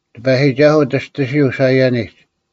ᑎᐸᔨᒋᒐᓱᐤ ᒋᔅᑎᓯᐤ ᓴᐃᔭᓂᒡ,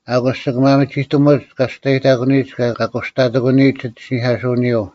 ᐊᑯᔅ ᒋᑭ ᒪᒥᒋᑕᒧᒡ ᑲ ᒋᔅᑕᔨᑕᑯᓂᔨᒡ ᑭᔭ ᑲ ᑯᔅᑕᑎᑯᓂᔨᒡ ᒋᑦ ᐃᓯᓂᐧᑲᓱᐅᓂᔪᐤ;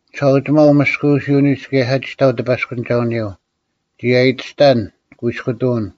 ᒋᓴᐅᒋᒪᐤ ᐅᒥᔅᑯᐅᓯᐅᓂᒡ ᑭᔭ ᓴᒋᑕᐤ ᑎᐸᔅᑯᓂᒐᐅᓂᔪᐤ; ᒋᑦ ᐊᔨᑎᔅᑕᓐ ᑯᐃᔅᑯᑐᐅᓐ,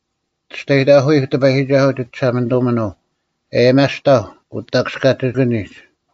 ᒋᔅᑕᔨᑕᑯᐃᐧᒄ ᑎᐸᔨᒋᒐᓱᐤ ᒋᒋᓴᒪᓂᑐᒥᓄᐤ, ᐊᔭᒥᐊᔅᑕᐧᒄ ᐅᑕᑯᔅᑲᒋᑭᓂᒡ;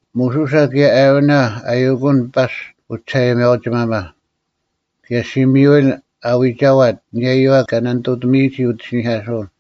ᒧᓱᓴ ᑭᔭ ᐊᕋᓇ ᐊᔪᑯᓐ ᐸᔅᒡ ᐅᒋᓴᐊᔭᒥᐊᐅᒋᒪᒪ, ᑭᔭ ᓴᒻᔪᐃᓪ ᐊ ᐎᒐᐛᑦ ᐊᓂᔭᔪᐛ ᑲ ᓇᓂᑐᑎᒥᔨᒋ ᐅᑦ ᐃᓯᓂᐧᑲᓱᐅᓐ;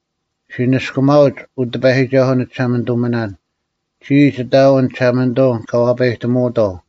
ᔅᒋ ᓂᔅᑯᒪᐅᒡ, ᐅ ᑎᐸᔨᒋᒐᓱᐤ ᓂᒋᓴᒪᓂᑐᒥᓇᓐ: ᒋᔾ ᒋᑦ ᐊᐎᓐ ᒋᓴᒪᓂᑐᐤ ᑲ ᐛᐸᔨᑎᒧᐅᑥᐤ,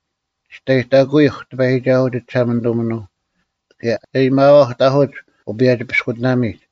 ᒋᔅᑕᔨᑕᑯᐃᐧᒄ ᑎᐸᔨᒋᒐᓱᐤ ᒋᒋᓴᒪᓂᑐᒥᓄᐤ, ᑭᔭ ᐊᔭᒥᐊᐛᐧᒄ ᑕᐧᑯᒡ ᐅᐸᔭᒋ-ᐱᔅᑯᑎᓇᒥᒡ;